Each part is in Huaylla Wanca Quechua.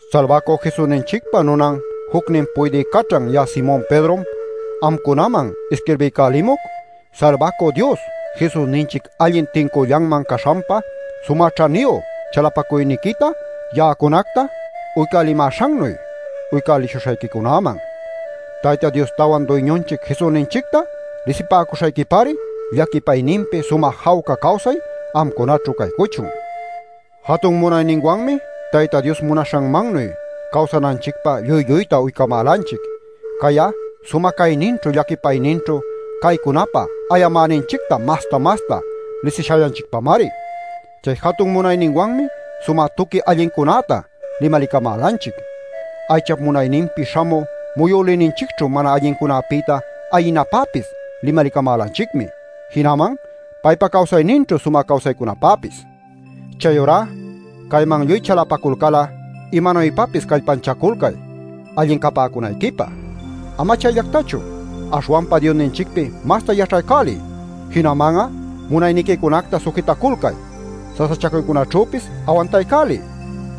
Salbacü Jesusninchicpa nunan jucnin puydï caćhan ya'a Simon Pedrom amcunaman isquirbiycälimuc Salbacü Dios Jesusninchic allin tincüllanman caśhanpa sumä ćhaniyu chalapacuyniquita ya'acunacta uycälimäśhannuy uycälishuśhayquicunäman. Tayta Diostawan Duyñunchic Jesusninchicta lisipäcuśhayquipari llaquipayninpi sumä jawca cawsay amcunaćhu caycuchun. Jatun munayninwanmi Tayta Dios munaśhanmannuy cawsananchicpä lluy-lluyta uycamälanchic. Cay'a sumä cayninćhu llaquipayninćhu caycunapä ayamäninchicta masta-masta lisishallanchicpamari. Chay jatun munayninwanmi sumä tuqui allincunäta limalicamälanchic. Aychap munayninpi śhamü muyülïninchicćhu mana allincunapïta ayinapäpis limalicamälanchicmi, jinaman paypa cawsayninćhu sumä cawsaycunapäpis. Chayurá cayman lluy chalapacul'a, imanuypapis callpanchaculcay allin capäcunayquipä. Ama chayllactachu, aśhwanpa Diosninchicpi masta yaćhaycäliy. Jinaman'a munayniquicunacta sujitaculcay, sasachacuycunaćhüpis awantaycäliy,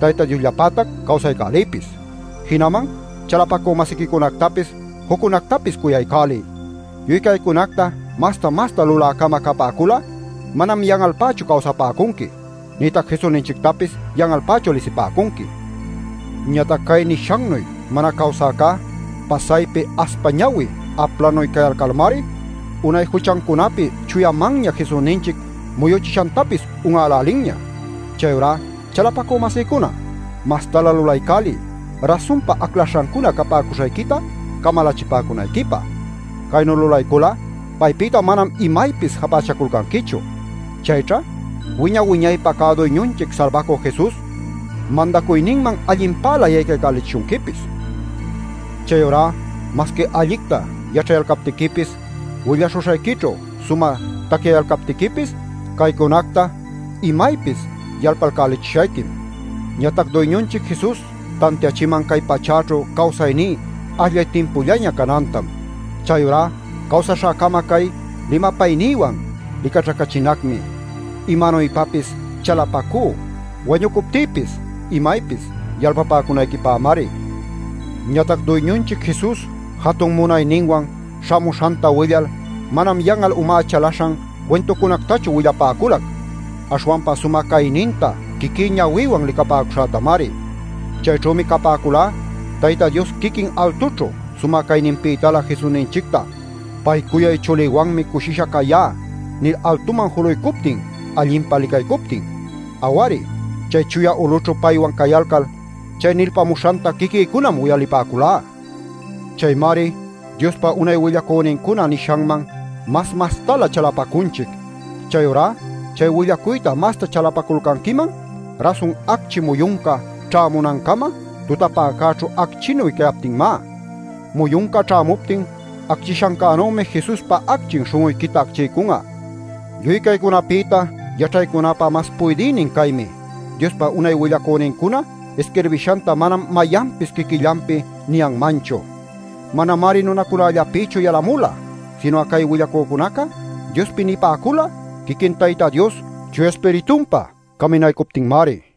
Tayta Diosllapätac cawsaycäliypis. Jinaman chalapacü-masiquicunactapis juccunactapis cuyaycäliy. Lluy caycunacta masta-masta lulä-cama capäcul'a manam yan'alpächu cawsapäcunqui nïtac Jesusninchictapis yan'alpächu lisipäcunqui. Ñatac cay nishannuy mana cawsäcá pasaypi aspa ñawi aplanuy cayalcalmari unay juchancunapi chuyamanña Jesusninchic muyuchishantapis un'älälinña. Chayurá chalapacü-masïcuna, mastalä lulaycäliy rasunpa aclaśhancuna capäcuśhayquita camalachipäcunayquipä. Caynu lulaycul'a paypïta manam imaypis japächaculcanquichu. Chayćha wiña-wiñaypä cä Duyñunchic Salbacü Jesus mandacuyninman allinpälä yaycaycälichishunquipis. Chayurá masqui allicta yaćhayalcaptiquipis willaśhuśhayquićhu sumä tacyayalcaptiquipis caycunacta imaypis yalpalcayächishayquim. Ñatac Duyñunchic Jesus tantiachiman cay pachäćhu cawsayní ashllay timpullaña canantam. Chayurá cawsaśhäcama cay limapaynïwan licaćhacachinacmi. Imanuypapis callpachacú wañucuptïpis imaypis yalpapäcunayquipämari. Ñatac Duyñunchic Jesus jatun munayninwan śhamuśhanta willal manam yan'al umá chalaśhan cuintucunactachu willapäculac, aśhwanpa sumä cayninta quiquí ñawïwan licapäcuśhätamari. Chayćhümi capäculá Tayta Dios quiquin altućhu sumä cayninpïtalä Jesusninchicta “Pay cuyay chulïwanmi cushisha cayá” nil altuman juluycuptin allinpa licaycuptin. Aw-ari, chay chuya ulućhu paywan cayalcal chay nilpamuśhanta quiquïcunam uyalipäculá. Chaymari Diospa unay willacünincuna nishanman mas-mastalä chalapacunchic. Chayurá chay willacuyta masta chalapaculcanquiman rasun acchi muyunca ćhämunancama tutapäcäćhu acchinuy cayaptinmá. Muyunca ćhämuptin acchishancänümi Jesuspa acchin śhun'uyquita acchiycun'a. Lluy caycunapïta yaćhaycunapä mas puydïnin caymi: Diospa unay willacünincuna isquirbishanta manam mayanpis quiquillanpi niyanmanchu. Manamari nunacunallapïchu yalamula, sinu'a cay willacücunaca Diospi nipäcula quiquin Tayta Dios Chuya Ispiritunpa caminaycuptinmari.